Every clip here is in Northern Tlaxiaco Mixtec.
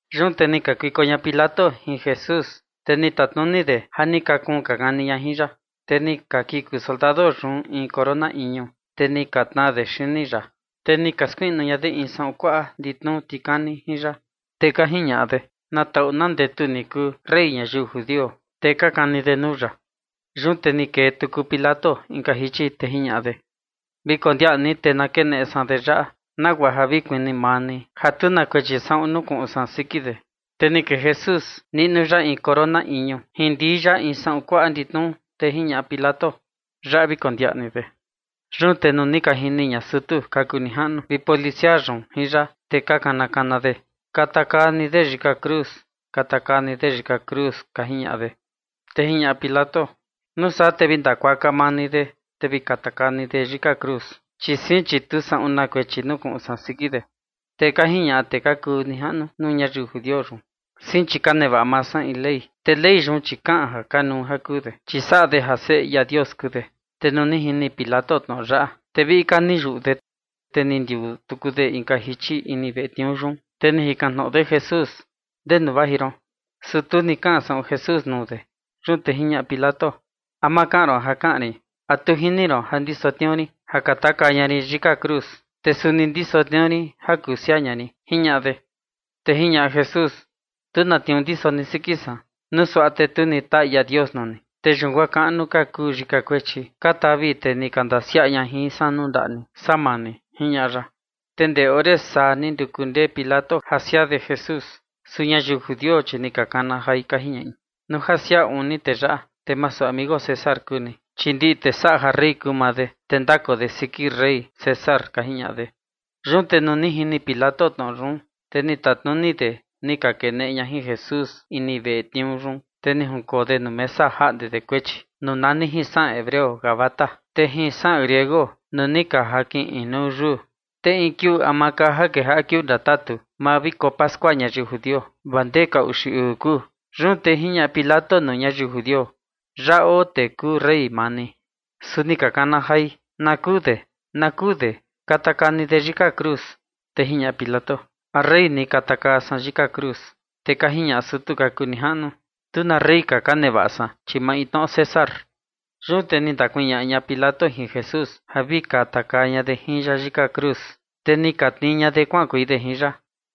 Yun te ni kakuiko ña Pilato jin Jesús, te ni tatnuni de ja ni ka kuun ka kani ña jin ya. Te ni ka kiku soldado yun in corona iñu, te ni ka tnaa de xini ya. Te ni ka skuiꞌnu ña de in saꞌun kuaꞌa nditnuu tikani jin ya. Te ka jiñaꞌa de: ―Na taꞌu na ndetu ni kuu, rey ñayiu judio. Te ka kani de nuu ya. Yun te ni kee tuku Pilato inka jichi, te jiñaꞌa de: ―Vi kondiaꞌa ni, te na keneꞌe san de yaꞌa, nagua ja vi kuni maa ni ja tu na kuechi saꞌun nukuꞌun san siki de. Te ni kee Jesús niꞌnu ya in corona iñu jin ndii ya in saꞌun kuaꞌa nditnuu, te jiñaꞌa Pilato: ―Yaꞌa vi kondiaꞌa ni de. Yun te nuu ni ka jini ña sutu ka kuu nijaꞌnu vi policia yun jin ya, te ni ka kana kana de: ―Katakaa ni de yika cruz, katakaa ni de yika cruz ―ka jiñaꞌa de. Te jiñaꞌa Pilato: ―Nuu saa te vi ndakuaka maa ni de, te vi katakaa ni de yika cruz, chi sein, te tu saꞌun na kuechi nukuꞌun san siki de. Te ka jiñaꞌa tee ka kuu nijaꞌnu nuu ñayiu judio yun: ―Sein chi ka nevaꞌa maa san in ley, te ley yun, chi kaꞌan ja kanuu ja kuu de, chi saꞌa de ja Seꞌe ia Dios kuu de. Te nuu ni jini Pilato tnoꞌo yaꞌa, te viꞌi ka ni yuꞌu de. Te ni ndiuu tuku de inka jichi ini veꞌe tniuu yun, te ni jikan tnoꞌo de Jesús: ―¿Ndenu vaji ron? Su tu ni kaꞌan saꞌun Jesús nuu de. Yun te jiñaꞌa Pilato: ―¿A ma kaꞌan ron ja kaꞌan rin? ¿A tu jini ron ja ndiso tniuu rin ja katakaa ña rin yika cruz, te suni ndiso tniuu rin ja kuu siaa ña rin? ―jiñaꞌa de. Te jiñaꞌa Jesús: ―Tu na tniuu ndiso ni siki san, nuu suaꞌa te tu ni taa ia Dios nuu ni. Te yun guaa kaꞌnu ka kuu yika kuechi ka tavi tee ni ka ndasiaꞌa ña jin san nuu ndaꞌa ni, saa maa ni ―jiñaꞌa ya. Te ndee ore saa ni nduku ndee Pilato ja siaa de Jesús, su ñayiu judio, chi ni ka kana jai, ka jiñaꞌi: ―Nuu ja siaa uun ni tee yaꞌa, te masu amigo César kuu ni, chi ndiꞌi tee saꞌa ja rey kuu maa de, te ndakoo de siki rey César ―ka jiñaꞌa de. Yun te nuu ni jini Pilato tnoꞌo yun, te ni tatnuni de ni ka keneꞌe ña jin Jesús ini veꞌe tniuu yun, te ni junkoo de nuu mesa ja jaꞌnde de kuechi, nuu nani jin saꞌan hebreo “Gabata”, te jin saꞌan griego nuu ni ka jakin inuu yuu. Te in kiuu ama ka ja kejaꞌa kiuu ndatatu maa viko pascua ñayiu judio, vaa ndee ka uxi uu kuu. Yun te jiñaꞌa Pilato nuu ñayiu judio: ―Yaꞌa oo tee kuu rey maa ni. Su ni ka kana jai: ―¡Na kuu de, na kuu de! ¡Katakaa ni de yika cruz! Te jiñaꞌa Pilato: ―¿A rey ni katakaa san yika cruz? Te ka jiñaꞌa sutu ka kuu nijaꞌnu: ―Tu na rey ka ka nevaꞌa san, chi maintnoꞌo César. Yun te ni ndakuñaꞌa ña Pilato jin Jesús ja vi katakaa ña de jin ya yika cruz. Te ni ka tnii ña de kuaꞌankuei de jin ya.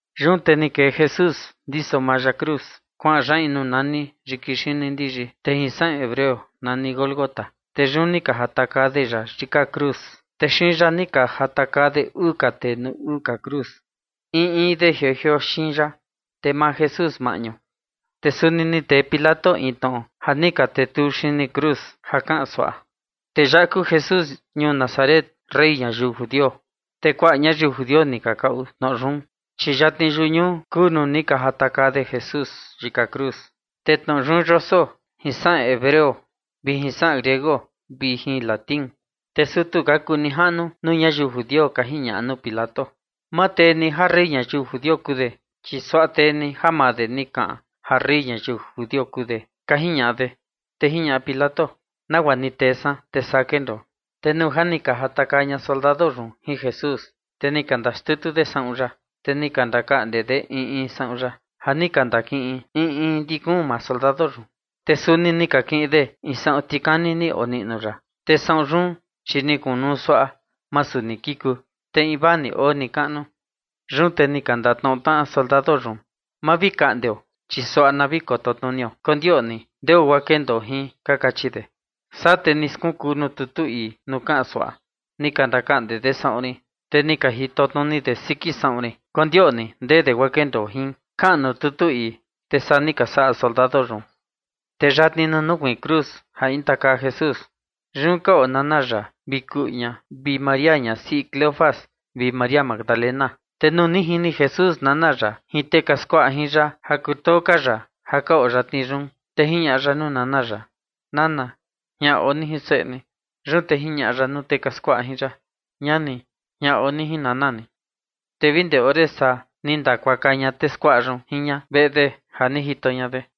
Yun te ni kee Jesús ndiso maa ya cruz, kuaꞌan ya in nuu nani yiki xini ndiyi, te jin saꞌan hebreo nani Gólgota. Te yun ni ka jatakaa de ya yika cruz, te xiin ya ni ka jatakaa de uu tee nuu uu ka cruz, in in de jioo jioo xiin ya, te maa Jesús maꞌñu. Te suni ni tee Pilato in tnoꞌo ja ni ka tetuu xini cruz, ja kaꞌan suaꞌa: “Tee yaꞌa kuu Jesús ñuu Nazaret, rey ñayiu judio”. Te kuaꞌa ñayiu judio ni ka kaꞌu tnoꞌo yun, chi yatni yuꞌu ñuu kuu nuu ni ka jatakaa de Jesús yika cruz, te tnoꞌo yun yoso jin saꞌan hebreo vi jin saꞌan griego vi jin latín. Te sutu ka kuu nijaꞌnu nuu ñayiu judio ka jiñaꞌa nuu Pilato: ―Ma tee ni ja rey ñayiu judio kuu de, chi suaꞌa tee ni ja maa de ni kaꞌan ja rey ñayiu judio kuu de ―ka jiñaꞌa de. Te jiñaꞌa Pilato: ―Nagua ni tee san, te saa kendoo. Te nuu ja ni ka jatakaa ña soldado yun jin Jesús, te ni ka ndaxtutu de saꞌun ya, te ni ka ndakaꞌnde de in in saꞌun ya ja ni ka ndakiꞌin in in ndi kuun maa soldado yun. Te suni ni ka kiꞌin de in saꞌun tikani ni oniꞌnu ya, te saꞌun yun, chi ni kunu suaꞌa, masu ni kiku, te invaa ni oo nikaꞌnu. Yun te ni ka ndatnoꞌo tnaꞌa soldado yun: ―Ma vi kaꞌndeo, chi suaꞌa na vi kototnunio kondioꞌni ndeo guaa kendoo jin ―ka kachi de. Saa te ni skunkuu nuu tutu ii nuu kaꞌan suaꞌa: “Ni ka ndakaꞌnde de saꞌun rin, te ni ka jitotnuni de siki saꞌun rin kondioꞌni ndee de guaa kendoo jin”, kaꞌan nuu tutu ii. Te saa ni ka saꞌa soldado yun. Te yatni nuu nukuiin cruz ja intakaa Jesús, yun ka oo nana ya vi kuꞌu ña vi María ñasiꞌi Cleofas vi María Magdalena. Te nuu ni jini Jesús nana ya jin tee ka skuaꞌa jin ya ja kutoo ka ya, ja ka oo yatni yun, te jiñaꞌa ya nuu nana ya: ―Nana, jian oo ni jin seꞌe ni. Yun te jiñaꞌa ya nuu tee ka skuaꞌa jin ya: ―Ñani, jian oo ni jin nana ni. Te vi ndee ore saa ni ndakuaka ña tee skuaꞌa yun jin ña veꞌe de ja ni jito ña de.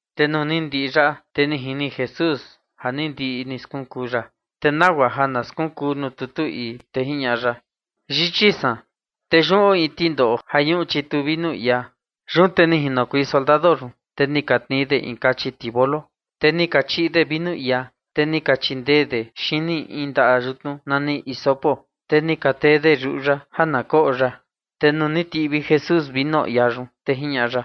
Te nuu ni ndiꞌi yaꞌa, te ni jini Jesús ja ni ndiꞌi ni skunkuu ya, te nagua ja na skunkuu nuu tutu ii, te jiñaꞌa ya: ―Yichi san. Te yun oo in tindoꞌo ja ñuꞌu chitu vinu iaa. Yun te ni jinokuei soldado, te ni ka tnii de in tivolo kachi, te ni ka chiꞌi de vinu iaa, te ni ka chindee de xini in ndaꞌa yutnu nani hisopo, te ni ka tee de yuꞌu ya ja na koꞌo ya. Te nuu ni tiꞌvi Jesús vinu iaa yun, te jiñaꞌa ya: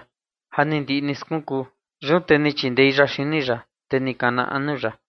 ―Ja ni ndiꞌi ni skunkuu. Yun te ni chindei ya xini ya, te ni kana anu ya.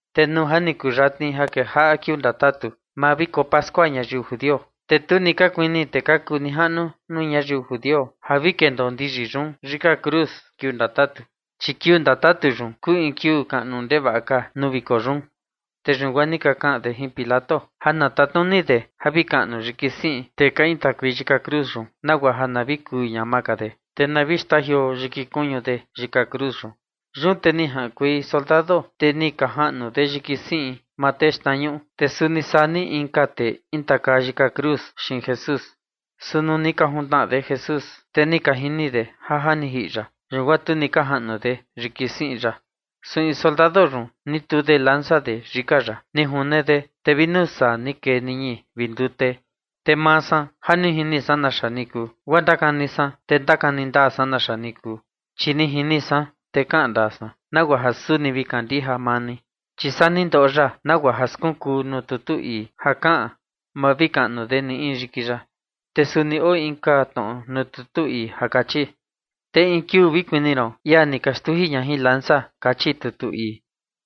Te nuu ja ni kuyatni ja kejaꞌa kiuu ndatatu maa viko pascua ñayiu judio, te tu ka kuini tee ka kuu nijaꞌnu nuu ñayiu judio ja vi kendoo ndiyi yun yika cruz kiuu ndatatu, chi kiuu ndatatu yun kuu in kiuu kaꞌnu ndevaꞌa ka nuu viko yun. Te yun guaa ni ka kaꞌan de jin Pilato ja na tatnuni de vi kaꞌnu yiki siꞌin tee intakuei yika cruz yun, nagua ja na vi kuu ñama ka de, te na vi xtajioo yiki kuñu de yika cruz yun. Yun te ni jaꞌankuei soldado, te ni ka jaꞌnu de yiki siꞌin tee xtnañuꞌu, te suni saa ni inka tee intakaa yika cruz xiin Jesús. Su nuu ni ka juntnaꞌa de Jesús, te ni ka jini de ja ja ni jiꞌi ya. Yun guaa tu ni ka jaꞌnu de yiki siꞌin ya. Su in soldado yun ni tuu de lanza de yika ya, ni june de, te vi nuu saa ni kee niñi vi ndute. Te maa san ja ni jini san naxa ni kuu, guaa ndakani san, te ndakani ndaa san naxa ni kuu, chi ni jini san, te kaꞌan ndaa san, nagua ja suni vi kandija maa ni. Chi saa ni ndoꞌo ya, nagua ja skunkuu nuu tutu ii ja kaꞌan: “Ma vi kaꞌnu de ni in yiki ya”. Te suni oo inka tnoꞌo nuu tutu ii ja kachi: “Te in kiuu vi kuni ron ia ni ka xtuji ña jin lanza”, kachi tutu ii.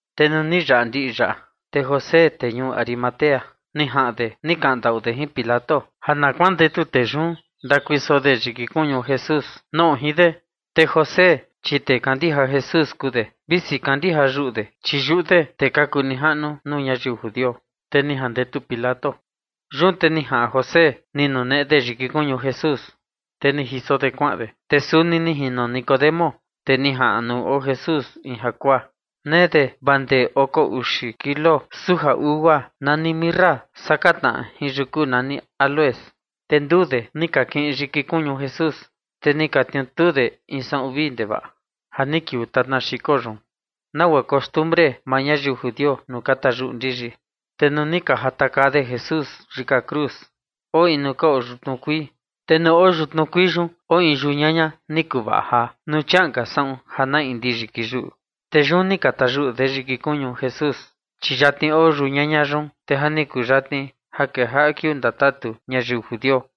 Te nuu ni yaꞌa ndiꞌi yaꞌa, te José, tee ñuu Arimatea, ni jaꞌan de ni kaꞌan ndaꞌu de jin Pilato ja na kuandetu tee yun ndakuiso de yiki kuñu Jesús, noꞌo jin de. Te José, chi tee kandija Jesús kuu de, visi kandija yuꞌu de, chi yuꞌu de tee ka kuu nijaꞌnu nuu ñayiu judio. Te ni jandetu Pilato. Yun te ni jaꞌan José, ni nuneꞌe de yiki kuñu Jesús, te ni jiso de kuaꞌan de. Te suni ni jino Nicodemo, tee ni jaꞌan nuu oo Jesús in jakuaa, nee de vaa ndee oko uxi kilo suja ugua nani mirra saka tnaꞌa jin yuku nani áloes. Te nduu de ni ka kiꞌin yiki kuñu Jesús, te ni ka tniutuu de in saꞌun vii ndevaꞌa ja ni kiuu tatna xiko yun, nagua costumbre maa ñayiu judio nuu ka tayuꞌi ndiyi. Te nuu ni ka jatakaa de Jesús yika cruz, oo in nuu ka oo yutnu kuii, te nuu oo yutnu kuii yun oo in yau ñaña ni kuvaꞌa jaa, nuu chiaꞌan ka saꞌun ja na ndiyi kiyuꞌu. Te yun ni ka tayuꞌu de yiki kuñu Jesús, chi yatni oo yau ñaña yun, te ja ni kuyatni ja kejaꞌa kiuu ndatatu ñayiu judio.